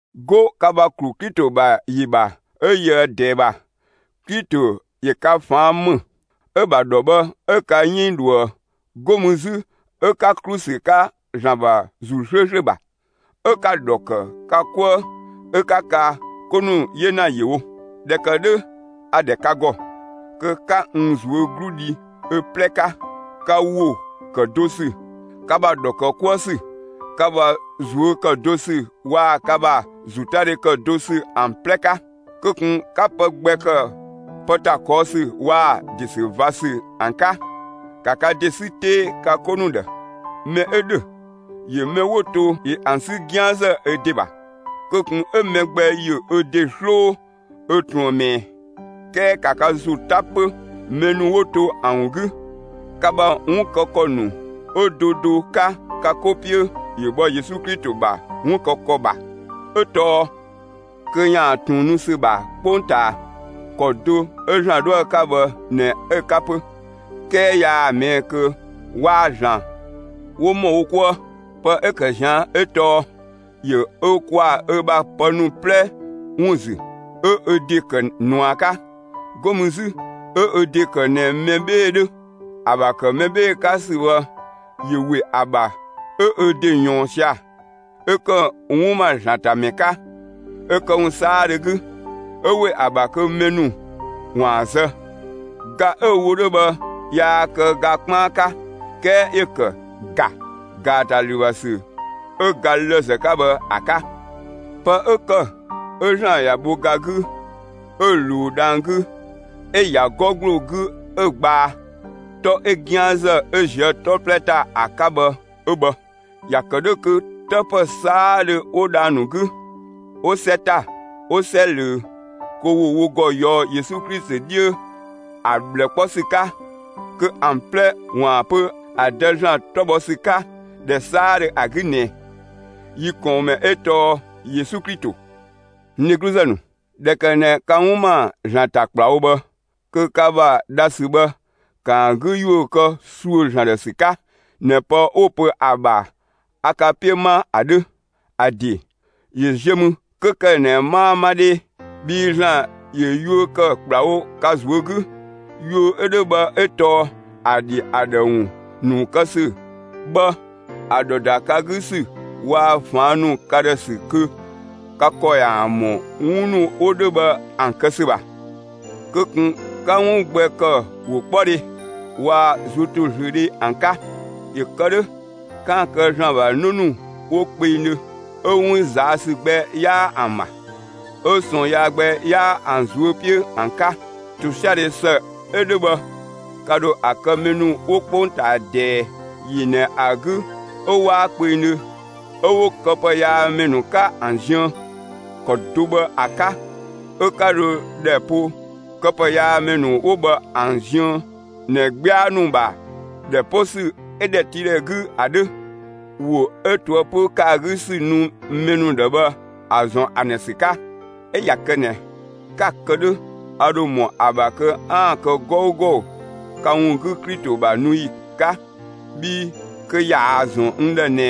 'Go ka ‑bha ‑klu Klito ‑bha ‑yi ‑bha 'ö yöë ꞊dɛɛ ‑bha, Klito ‑yö ka ꞊faan' ‑më, 'ö‑ ‑bha ‑dhɔ bhë 'ö ka 'yënng ꞊dhuë'. 'Go mü 'zü 'ö 'ka ‑klu ‑sü 'ka ‑Zlan ‑bha ‑Zuu 'slööslö ‑bha. 'Ö 'ka‑ ‑dhɔ ‑kë ka 'kuë 'ö 'ka ka 'ko ‑nu 'yena ‑yö wo. ꞊Dhɛ ‑kë 'dhö, a‑ ‑dhɛ ka ‑gɔ, kö 'ka n ꞊zuö' 'glu dhi ö 'plɛ 'ka, ka ‑wo ‑kë do ‑sü, ka ‑bha ‑dhɔ ‑kë 'kuë ‑sü, ka ‑bha ꞊zuö' ‑kë do ‑sü waa‑ ka ‑bha ‑zotadhe ‑kë do ‑sü ‑an 'plɛ 'ka. Kö ꞊kun 'ka pë gbɛ ‑kë pë ‑ta ꞊kɔɔ' ‑sü waa‑ ‑de ‑sü ꞊va ‑sü ‑an 'ka! ‑Ka ka ‑de 'sü 'tee ka 'ko ‑nu ‑dhë! Mɛ 'ö ‑dhö ‑yö mɛ 'wo to ‑yö ‑an 'sü 'gianzë ö ‑de ‑bha! Kö ꞊kun 'ö mɛ gbɛ ‑yö ö ‑de 'sloo ö ꞊truën ꞊mɛɛ, 'kɛɛ ‑ka ka ‑zo 'ta 'pö, mɛ ‑nu 'wo to ‑an ‑wun 'gü! Ka ‑bha 'wun kë ‑kɔ ‑nu 'ö do do 'ka ka 'ko 'piö, ‑yö bhɔ Yesu Klito ‑bha 'wun kë ‑kɔ ‑bha, 'ö tɔɔ: Kö ‑yaan ꞊tun nu ‑sü ‑bha 'kpongtaa, ‑kɔ do 'ö ‑Zlan 'dhoë‑ 'ka bhë ꞊nɛ 'ö‑ 'ka 'pö. 'Kɛɛ yaa‑ ꞊mɛɛ' kö waa‑ ‑Zlan 'wo ‑mɔ wo 'kuë. Pë 'ö‑ ‑kë ꞊zian' 'ö tɔɔ: ‑Yö ö ‑kwaa ö ‑bha pë ‑nu 'plɛ ‑wun ‑zü, 'ö ö ‑de ‑kë ꞊nua 'ka. 'Go mü 'zü 'ö ö ‑de ‑kë ꞊nɛ mɛ 'bhee‑ 'dhö. ‑A ‑bha ‑kë mɛ 'bhee‑ 'ka ‑sü bhë, ‑yö ‑we ‑a ‑bha 'ö ö ‑de ꞊yɔɔn sia‑, 'ö ‑kë 'wun ‑ma ‑Zlan ‑ta ‑mɛ 'ka ö këwun 'saadhö 'gü, 'ö ‑we ‑a ‑bha kö mɛ ‑nu ‑waan zë. Ga 'ö‑ wo 'dhö bhë yaa kë ga 'kpaan 'ka 'kɛɛ ‑yö ‑kë ‑ga ‑gaatalü ‑bha ‑sü 'ö ga lëzë 'ka bhë ‑a 'ka. Pë 'ö ‑kë 'ö ‑Zlan ‑ya bho ga 'gü 'ö‑ ꞊luu dhang‑ 'gü, 'ö‑ ‑ya 'gɔ ‑gbloo 'gü 'ö‑ gbaa 'tɔ 'ö 'gianzë 'ö ꞊zië' 'tɔ 'plɛ ‑ta ‑a 'ka bhë 'ö bhë. ꞊Ya kë 'dhö kö 'të ‑pë 'saadhö 'wo dhang‑ ‑nu 'gü, 'wo 'sɛ ‑ta, 'wo 'sɛ ꞊löö, kö ‑wo wo ‑gɔ ꞊yɔɔ'‑ Yesu 'dhiö ‑a ꞊bhlë 'kpɔ ‑sü 'ka, kö ‑an 'plɛ ‑waan pö ‑a Dë ‑Zlan 'tɔ bhɔ ‑sü 'ka, ‑dhɛ 'saadhö ‑a 'gü ꞊nɛ: Yi ꞊kɔɔnmɛ 'ö tɔɔ Yesu Klito. N dhegluzë ‑nu, ꞊dhɛ ‑kë ꞊nɛ ka 'wun ‑ma ‑Zlan ‑ta ‑kplawo bhë, kö ka ‑bha dhasü bhë, ‑kaa 'gü ‑yuö kë ‑süë ‑Zlan ‑dhë ‑sü 'ka ꞊nɛ pë 'wo‑ pö ‑a ‑bha a ka 'piö ma ‑a 'dhö; ‑a ‑de ‑yö ziö mü 'kö ‑kë ꞊nɛ 'maa 'ma 'dhee. Bhii ‑Zlan ‑yö yuö ‑kë ‑kplawo ka ꞊zuö' 'gü. Yuö 'ö 'dhö bhë 'ö tɔɔ ‑a ‑dhi ‑a ‑dhë ‑wun ‑nu kë ‑sü bhë ‑a ‑dhɔ ‑da ka 'gü ‑sü waa‑ ꞊faan' nu ka ‑dhë ‑sü kö ka ‑kɔ ‑yaan ‑mɔ 'wun ‑nu 'wo 'dhö bhë ‑an kë ‑sü ‑bha. Kö ꞊kun 'ka 'wun gbɛ ‑kë ‑wokpɔdhe waa‑ ꞊zuötozlöödhe ‑an 'ka! ‑Yö kë 'dhö, 'kaan‑ kë ‑Zlan ‑bha 'në ‑nu 'wo kpengdhö 'ö 'wun ꞊zaa' ‑sü gbɛ 'yaa ‑an ‑bha, 'ö ꞊sɔɔn yaa gbɛ 'yaa ‑an ꞊zuö' 'piö ‑an 'ka. ‑Tosiadhe ‑së 'ö 'dhö bhë, ka ‑dho ‑a kë mɛ ‑nu 'wo 'kpongtaa ꞊dɛɛ ‑yi ꞊nɛ ‑a 'gü 'ö 'waa kpengdhö 'ö 'wo këpëyaamɛ ‑nu 'ka ‑an ziën. ‑Kɔ do bhë ‑a 'ka 'ö 'ka dho ‑dhɛ po këpëyaamɛ ‑nu 'wo bhë ‑an ziën ꞊nɛ 'gbia ‑nu ‑bha ‑dhɛ 'po ‑sü 'ö ‑dhɛtiidhɛ 'gü ‑a 'dhö, ‑wo 'ö ꞊toëpö ‑kë ‑a 'gü ‑sü nu mɛ ‑nu ‑dhë bhë ‑a ‑zɔn ‑an ‑dhë ‑sü 'ka. 'Ö ꞊ya kë ꞊nɛ, 'ka‑ kë 'dhö, a ‑dho ‑mɔ ‑a ‑bha kö 'aan‑ kë 'gɔugɔ ka ‑wun 'gü Klito ‑bha nu ‑yi 'ka. Bhii kö ꞊yaa‑ ‑zɔn n ‑dhë ꞊nɛ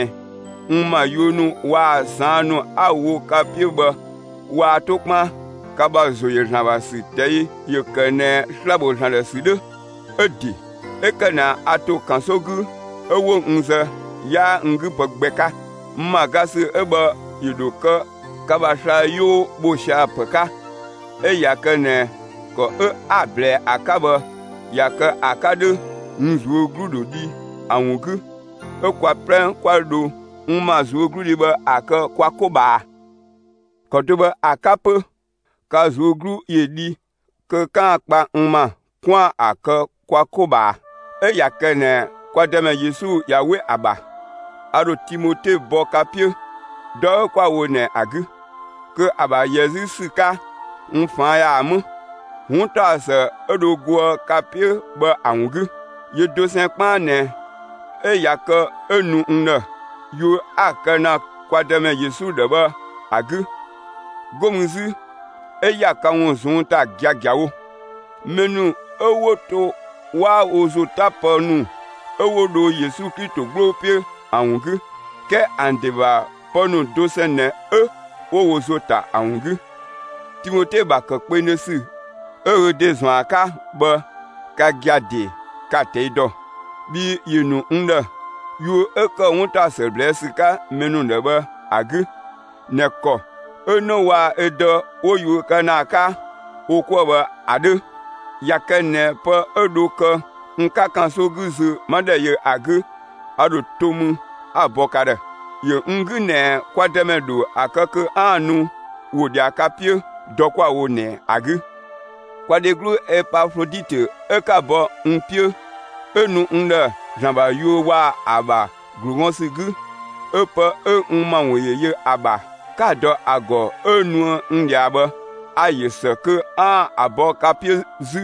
n ‑ma yuö ‑nu waa‑ ꞊saan' ‑nu 'a‑ wo ka 'piö bhë waa 'to 'kpaan. Ka ‑bha ‑zo ‑yö ‑Zlan ‑bha ‑sü ꞊tɛi' ‑yö kë ꞊nɛ sla‑ ‑bho ‑Zlan ‑dhë ‑sü 'dhö. 'Ö ‑de 'ö ‑kë ꞊nɛ a ‑to ‑kanso 'gü 'ö 'wo n zë, 'yaa n 'gü pë gbɛ 'ka. N ‑ma ga ‑sü 'ö bhë ‑yö ‑dho kë ka ‑bha sla‑ 'yoo ‑bho sia‑ ‑pë 'ka. 'Ö ꞊ya kë ꞊nɛ, ‑kɔ 'ö 'a‑ ꞊blɛɛ ‑a 'ka bhë ꞊ya kë ‑a 'ka 'dhö, n ꞊zuö' 'glu ‑dho dhi ‑a ‑wun 'gü. 'Ö kwa 'plɛ 'kwa dho n ‑ma ꞊zuögludhi bhë ‑a kë kwa 'ko ꞊bhaa. ‑Kɔ do bhë ‑a 'ka 'pö, ka ꞊zuö' 'glu ‑yö dhi kö 'kaan‑ kpa n ‑ma 'kwaan‑ ‑a kë kwa 'ko ꞊bhaa. 'Ö ꞊ya kë ꞊nɛ kwa Dëmɛ Yesu ꞊ya 'we ‑a ‑bha, a ‑dho Timote bɔ ka 'piö, dɔ 'ö 'kwa‑ wo ꞊nɛ ‑a 'gü, kö ‑a ‑bha ‑yɛ 'zü ‑sü 'ka, n ꞊faan' ‑yaan 'më, 'wuntaɔsë 'ö dho goë ka 'piö bhë ‑a ‑wun 'gü. Yö dosɛn 'kpaan ꞊nɛ 'ö ꞊ya kë 'ö nu n ‑dhë, yuö 'a‑ kë ‑na kwa Dëmɛ Yesu ‑dhë bhë ‑a 'gü. 'Go mü 'zü 'ö ‑ya ka ‑wun ꞊zɔnng' ‑ta giagiawo. Mɛ ‑nu 'ö 'wo to 'waa wo ‑zo 'ta pë ‑nu 'ö 'wo dho Yesu Klito 'gbloo 'piö ‑an ‑wun 'gü, 'kɛɛ ‑an ‑de ‑bha pë ‑nu dosɛn ꞊nɛ 'ö 'wo wo ‑zo ‑ta ‑an ‑wun 'gü. Timote ‑bha ‑kë kpengdhö ‑sü 'ö ö ‑de ‑zɔn ‑a 'ka bhë, ka gia‑ ‑de, 'ka‑ ꞊tɛi' dɔ. Bhii ‑yö ‑nu n ‑dhë, yuö 'ö ‑kë 'wuntaɔsë ꞊blɛɛ' ‑sü 'ka mɛ ‑nu ‑dhë bhë ‑a 'gü ꞊nɛ ‑kɔ 'ö 'në waa‑ ö dë 'wo yuö kë ‑na ‑a 'ka wo 'kuë‑ bhë ‑a 'dhö. ꞊Ya kë ꞊nɛ pë 'ö dho kë n 'ka ‑kanso 'gü zö, 'ma ‑dhɛ yö ‑a 'gü, a ‑dho to mü 'a‑ bɔ ka ‑dhë. ‑Yö n 'gü ꞊nɛ kwa Dëmɛ dho ‑a kë kö 'aan‑ nu ‑wo ꞊dhia ka 'piö, dɔ 'kwa‑ wo ꞊nɛ ‑a 'gü. Kwa dheglu Epafloditö 'ö 'ka‑ bɔ n 'piö 'ö nu n ‑dhë ‑Zlan ‑bha yuö waa‑ ‑a ‑bha ‑glu gɔn ‑sü 'gü, 'ö pë 'ö n ‑ma ‑wun ‑yö yö ‑a ‑bha, 'ka‑ dɔ ‑a ‑gɔ 'ö nuë n ꞊dhia bhë, a‑ ‑yö ‑së kö 'aan‑ ‑a bɔ ka 'piö 'zü.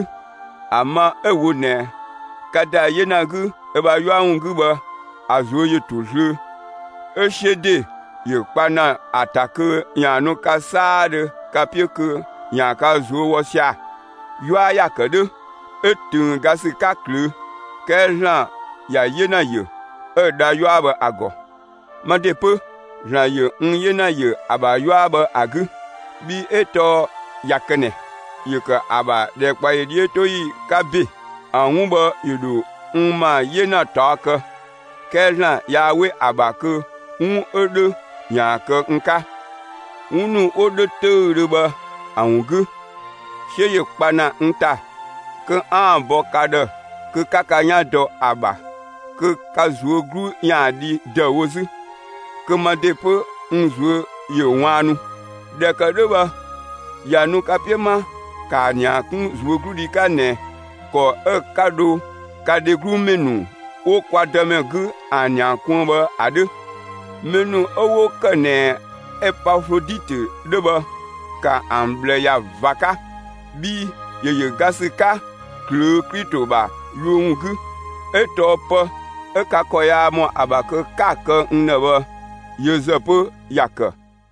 ‑A ma 'ö‑ wo ꞊nɛ, ka ‑da 'yena 'gü ö ‑bha 'yua ‑wun 'gü bhë, ‑a ꞊zuö' ‑yö ‑to zlöö; ‑a 'siö ‑de ‑yö kpa ‑na ‑a ‑ta kö ‑yaan nu ka 'saadhö ka 'piö kö ‑yaan ka ꞊zuö' wɔ sia‑. 'Yua ‑ya ‑kë 'dhö! 'Ö ꞊töng ga ‑sü 'ka ꞊klöö'. 'Kɛɛ ‑Zlan ‑ya 'yena ‑yö, 'ö‑ dha 'yua bhë ‑a ‑gɔ. Ma ‑de 'pö, ‑Zlan ‑yö n 'yena ‑yö ‑a ‑bha 'yua bhë ‑a 'gü. Bhii 'ö tɔɔ ꞊ya kë ꞊nɛ, ‑yö ‑kë ‑a ‑bha ‑dhɛkpaɔyi 'dhiötoyi 'ka ‑be, ‑a 'wun bhë ‑yö ‑dho n ‑ma 'yena ꞊taɔ' kë. 'Kɛɛ ‑Zlan yaa 'we ‑a ‑bha kö 'wun 'ö 'dhö ‑yaan kë n 'ka. 'Wun ‑nu 'wo 'dhö 'töüdhö bhë ‑a ‑wun 'gü, 'siö ‑yö kpa ‑na n ‑ta kö 'aan‑ ‑a bɔ ka ‑dhë kö 'ka ka 'yan dɔ ‑a ‑bha, kö ka ꞊zuö' 'glu 'yaan‑ dhi ‑dëüwo 'zü, kö ma ‑de 'pö n ꞊zuö' ‑yö ꞊waannu. ꞊Dhɛ ‑kë 'dhö bhë, ꞊ya nu ka 'piö 'ma, ‑kaa ‑nia 'kun ꞊zuögludhi 'ka ꞊nɛ ‑kɔ 'ö 'ka dho ka dheglu mɛ ‑nu 'wo kwa Dëmɛ 'gü ‑an ‑nia kuën bhë ‑a 'dhö. Mɛ ‑nu 'ö 'wo ‑kë ꞊nɛ Epafloditö 'dhö bhë, ‑ka ‑an ꞊bhlë ‑ya ꞊va 'ka! Bhii ‑yö ‑yö ga ‑sü 'ka ꞊klöö' Klito ‑bha yuö ‑wun 'gü. 'Ö tɔɔ pë 'ö ka ‑kɔ yaa ‑mɔ ‑a ‑bha kö 'ka‑ kë n ‑dhë bhë, yö ‑zë 'pö, ‑ya ‑kë.